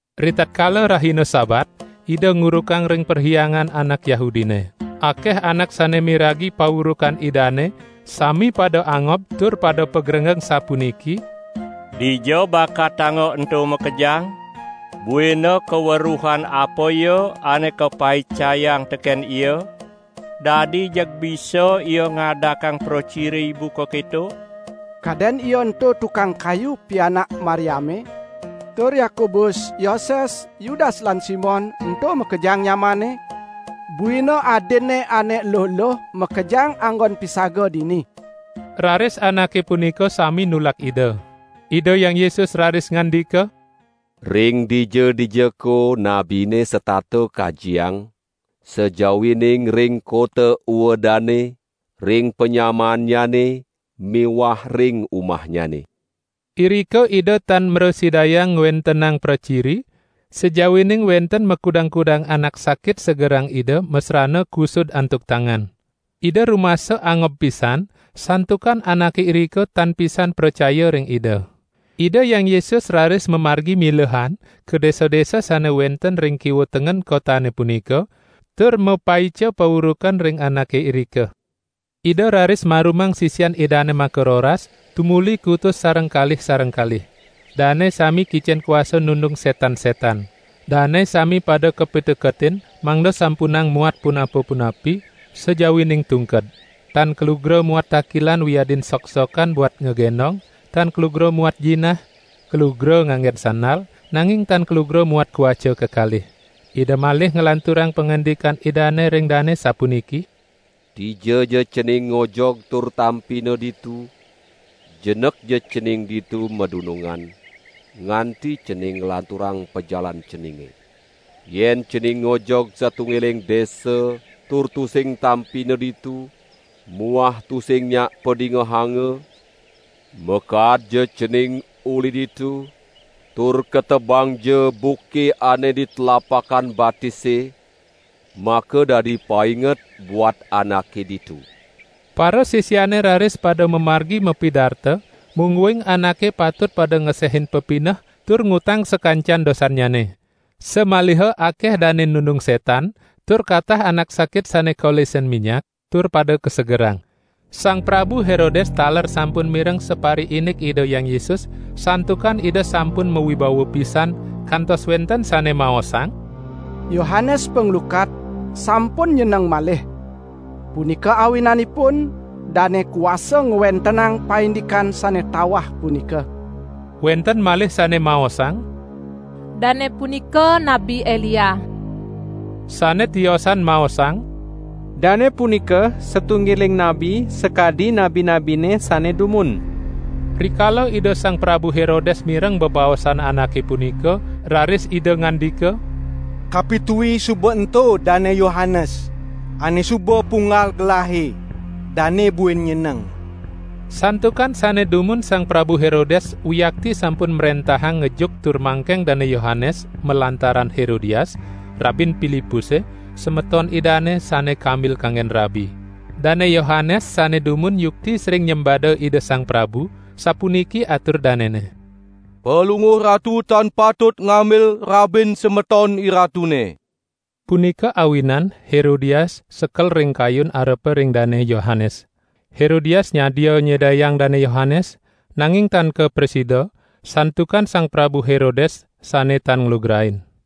Ritatkala rahina Sabat, Ida ngurukang ring perhyangan anak Yahudine. Akeh anak sane miragi paurukan Idane sami pada angob tur pada pagrenggeng sapuniki: "Dija bakatanga ento makejang? Buina kaweruhan apaya ane kapaicayang teken Ia? Dadi jeg bisa Ia ngadakang praciri buka keto? Kaden Ia ento tukang kayu, pianak Mariame? Tur Yakobus, Yoses, Yudas lan Simon ento makejang nyamanNe? Buina adinNe ane eluh-eluh makejang anggon pisaga dini!" Raris anake punika sami nulak Ida. Ida Hyang Yesus raris ngandika: "Ring dija-dijako nabine setata kajiang, sajawining ring kota uedane, ring panyamaannyane miwah ring umahnyane." Irika Ida tan mrasidayang ngwentenang praciri, sajawining wenten makudang-kudang anak sakit segerang Ida masrana kusud antuk tangan. Ida rumasa angob pisan, santukan anake irika tan pisan pracaya ring Ida. Ida Hyang Yesus raris mamargi milehan ka desa-desa sane wenten ring kiwa tengen kotane punika, tur mapaica paurukan ring anake irika. Ida raris marumang sisian Idane makaroras, tumuli kutus sareng kalih sareng kalih. Dane sami kicen kuasa nundung setan-setan. Dane sami pada kapiteketin mangda sampunang muat punapa-punapi, sajawining tungked. Tan kalugra muat takilan wiadin sok-sokan buat ngagendong, tan kalugra muat jinah, kalugra nganggen sandal, nanging tan kalugra muat kawaca kekalih. Ida malih nglanturang pangandikan Idane ring dane sapuniki: "Dijaja cening ngojog tur tampina ditu, jenekja cening ditu madunungan, nganti cening nglanturang pajalan ceninge. Yen cening ngojog satunggiling desa tur tusing tampina ditu muah tusing nyak padingehanga, makaadja cening uli ditu tur ketebangja buke ane di tlapakan batise, makadadi painget buat anake ditu." Parasisiane raris pada mamargi mapidarta mungguing anake patut pada ngesehin pepineh tur ngutang sakancan dosannyane. Samaliha akeh dane nundung setan, tur katah anak sakit sane kolesin minyak tur pada kasegerang. Sang Prabu Herodes taler sampun mireng sapariindik Ida Hyang Yesus, santukan Ida sampun mawibawa pisan, kantos wenten sane maosang: "Yohanes Panglukat, sampun nyeneng malih. Punika awinanipun dane kuasa ngwentenang paindikan sane tawah punika." Wenten malih sane maosang: "Dane punika Nabi Elia." Sane tiosan maosang: "Dane punika satunggiling nabi sakadi nabi-nabine sane dumun." Rikala Ida Sang Prabu Herodes mireng bebaosan anake punika, raris ida ngandika: "Kapitui suba ento Dane Yohanes ane suba punggal gelahe, dane buin nyeneng." Santukan sane dumun Sang Prabu Herodes wiakti sampun mrentahang ngejuk tur mangkeng Dane Yohanes malantaran Herodias, rabin Pilipuse, semeton idane, sane kambil kanggen rabi. Dane Yohanes sane dumun yukti sering nyembada ida sang prabu, sapuniki atur danene: "Palungguh ratu tan patut ngambil rabin semeton iratune." Punika awinan Herodias sekel ring kayun arepa ring Dane Yohanes. Herodias nyadia nyedayang Dane Yohanes, nanging tan kaprasida, santukan Sang Prabu Herodes sane tan nglugrain.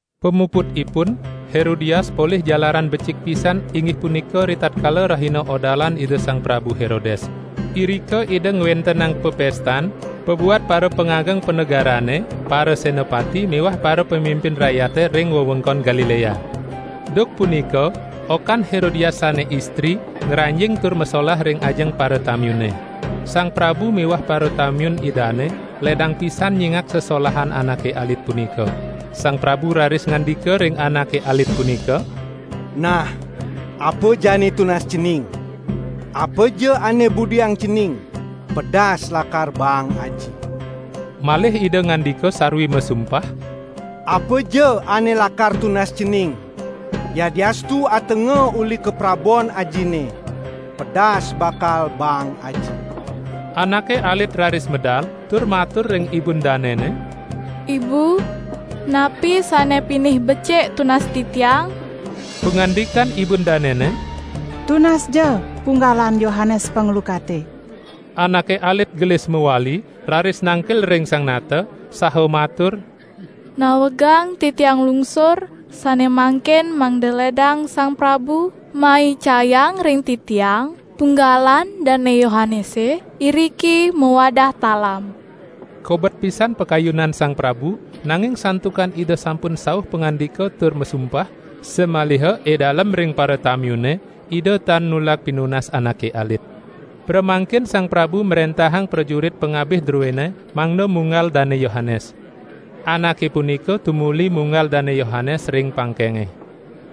Pamuputipun Herodias polih jalaran becik pisan inggih punika ritatkala rahina odalan Ida Sang Prabu Herodes. Irika ida ngwentenang pepestan pabuat parapangageng panegarane, parasenapati miwah parapamimpin rakyate ring wewengkon Galilea. Duk punika okan Herodias sane istri ngranjing tur masolah ring ajeng paratamiune. Sang prabu miwah paratamiun idane ledang pisan nyingak sesolahan anake alit punika. Sang prabu raris ngandika ring anake alit punika: "Nah apa jani tunas cening; apaja ane budiang cening pedas lakar baang aji." Malih ida ngandika sarwi masumpah: "Apaja ane lakar tunas cening, yadiastu atenga uli kaprabon ajine, pedas bakal baang aji." Anake alit raris medal, tur matur ring ibun danene: "Ibu, napi sane pinih becik tunas titiang?" Pangandikan ibun danene: "Tunasja punggalan Yohanes Panglukate." Anake alit gelis mawali, raris nangkil ring sang nata, saha matur: "Nawegang titiang nglungsur, sane mangkin mangda ledang sang prabu maicayang ring titiang punggalan Dane Yohanese, iriki mawadah talam." Kobet pisan pakayunan sang prabu, nanging santukan ida sampun sauh pangandika tur masumpah, samaliha edalem ring paratamiune, ida tan nulak pinunas anake alit. Pramangkin sang prabu mrentahang prajurit pangabih druene mangda munggal Dane Yohanes. Anake punika tumuli munggal Dane Yohanes ring pangkenge.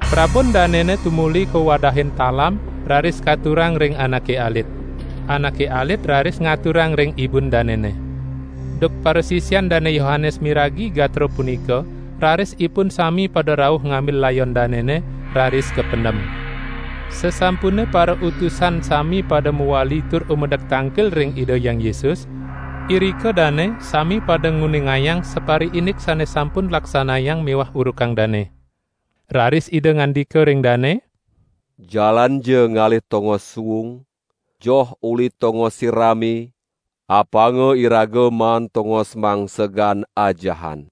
Prabun danene tumuli kawadahin talam raris katurang ring anake alit. Anake alit raris ngaturang ring ibun danene. Duk parasisian Dane Yohanes miragi gatra punika raris ipun sami pada rauh ngambil layon danene, raris kapendem. Sasampune parautusan sami pada mawali tur umedek tangkil ring Ida Hyang Yesus, irika dane sami pada nguningayang sapariindik sane sampun laksanayang miwah urukang dane. Raris Ida ngandika ring dane: "Jalanja ngalih tongos suung, joh uli tongose rame, apanga iraga maan tongos mangsegan ajahan."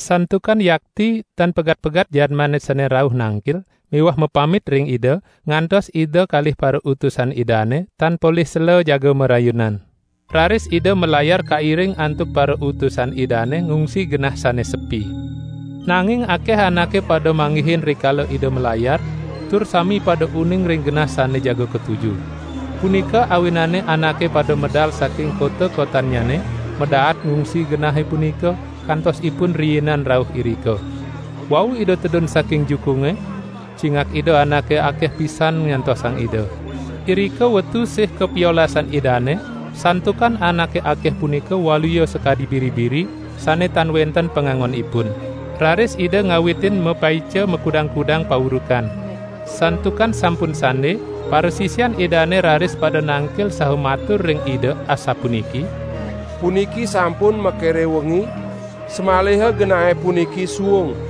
Santukan yakti tan pegat-pegat jadmane sane rauh nangkil miwah mapamit ring Ida, ngantos Ida kalih parautusan Idane tan polih sela jaga marayunan. Raris Ida malayar kairing antuk parautusan Idane ngungsi genah sane sepi. Nanging akeh anake pada manggihin rikala Ida malayar, tur sami pada uning ring genah sane jaga katuju. Punika awinane anake pada medal saking kota-kotannyane, madaat ngungsi genahe punika, kantos ipun riinan rauh irika. Wau Ida tedun saking jukunge, cingak Ida anake akeh pisan nyantosang Ida. Irika wetu sih kapiolasan Idane, santukan anake akeh punika waluya sakadi biri-biri sane tan wenten pangangonipun. Raris Ida ngawitin mapaica makudang-kudang paurukan. Santukan sampun sande, parasisian Idane raris pada nangkil saha matur ring Ida, asapuniki: "Puniki sampun makire wengi, samaliha genahe puniki suung.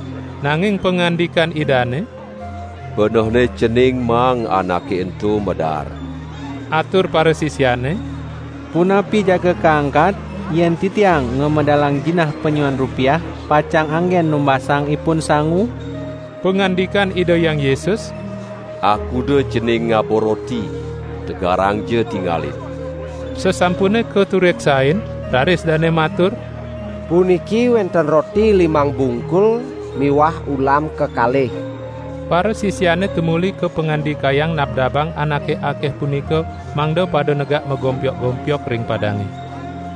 Nanging pangandikan Idane: "Benehne cening maang anake ento madaar!" Atur parasisiane: "Punapi jaga kangkat yen titiang ngamedalang jinah panyiuan rupiah pacang anggen numbasang ipun sangu." Pangandikan Ida Hyang Yesus: "Akuda cening ngaba roti? Tegarangja tingalin!" Sasampune katureksain, raris dane matur: "Puniki wenten roti limang bungkul miwah ulam kekalih." Parasisiane tumuli kapangandikayang nabdabang anake akeh punika mangda pada negak magompyok-gompyok ring padange.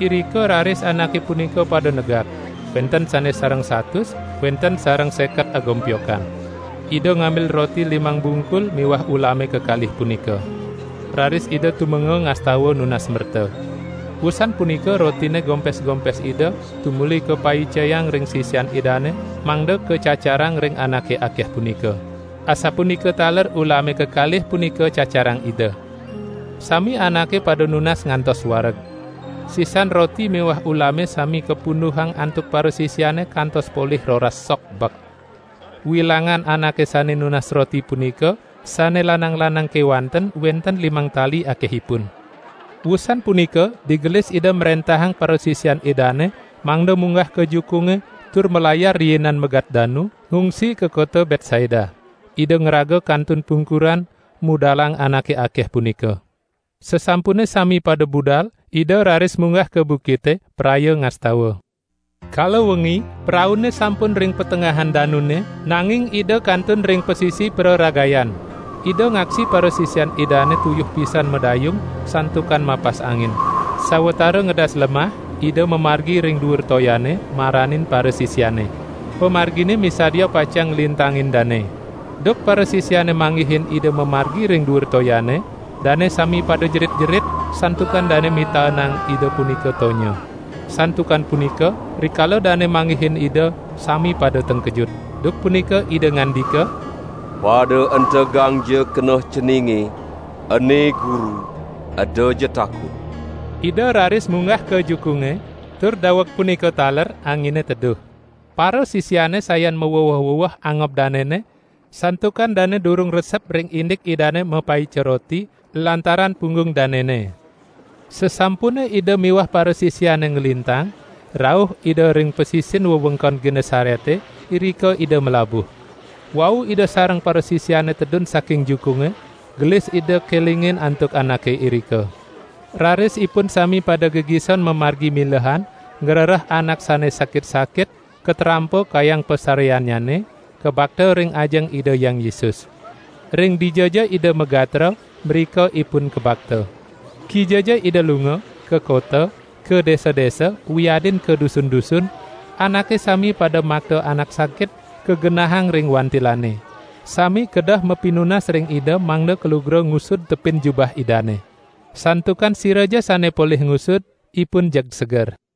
Irika raris anake punika pada negak. Wenten sane sareng satus, wenten sareng seket agompyokan. Ida ngambil roti limang bungkul miwah ulame kekalih punika. Raris Ida tumenga ngastawa nunas merta. Wusan punika rotine gompes-gompes Ida tumuli kapaicayang ring sisian Idane mangda kacacarang ring anake akeh punika. Asapunika taler ulame kekalih punika cacarang Ida. Sami anake pada nunas ngantos wareg. Sisan roti miwah ulame sami kapunduhang antuk parasisiane kantos polih roras sok bek. Wilangan anake sane nunas roti punika, sane lanang-lanang kewanten wenten limang tali akehipun. Wusan punika, digelis Ida mrentahang parasisian Idane mangda munggah ka jukunge tur malayar riinan megat danu, ngungsi ka kota Betsaida. Ida ngraga kantun pungkuran, mudalang anake akeh punika. Sasampune sami pada budal, Ida raris munggah ka bukite, praya ngastawa. Kala wengi, praune sampun ring patengahan danune, nanging Ida kantun ring pasisi praragayan. Ida ngaksi parasisian Idane tuyuh pisan madayung, santukan mapas angin. Sawatara ngedas lemah, Ida mamargi ring duur toyane, maranin parasisiane. Pamargine misadia pacang nglintangin dane. Duk parasisiane manggihin Ida mamargi ring duur toyane, dane sami pada jerit-jerit, santukan dane mitaenang Ida punika tonya. Santukan punika, rikala dane manggihin Ida, sami pada tengkejut. Duk punika Ida ngandika: "Pada entegangja keneh ceninge, ene Guru, edaja takut!" Ida raris munggah ka jukunge, tur daweg punika taler angine teduh. Parasisiane sayan maweweh-weweh angob danene, santukan dane durung resep ring indik Idane mapaica roti, lantaran punggung danene. Sasampune Ida miwah parasisiane nglintang, rauh Ida ring pasisin wewengkon Genesarete, irika Ida malabuh. Wau Ida sareng parasisiane tedun saking jukunge, gelis Ida kelingin antuk anake irika. Raris ipun sami pada gegison mamargi milehan ngrereh anak sane sakit-sakit katrampa kayang pasareannyane, kabakta ring ajeng Ida Hyang Yesus. Ring dijaja Ida magatra, mrika ipun kabakta. Kijaja Ida lunga, ka kota, ka desa-desa, wiadin ka dusun-dusun, anake sami pada makta anak sakit, kagenahang ring wantilane. Sami kedeh mapinunas ring Ida mangda kalugra ngusud tepin jubah Idane. Santukan siraja sane polih ngusud, ipun jeg seger.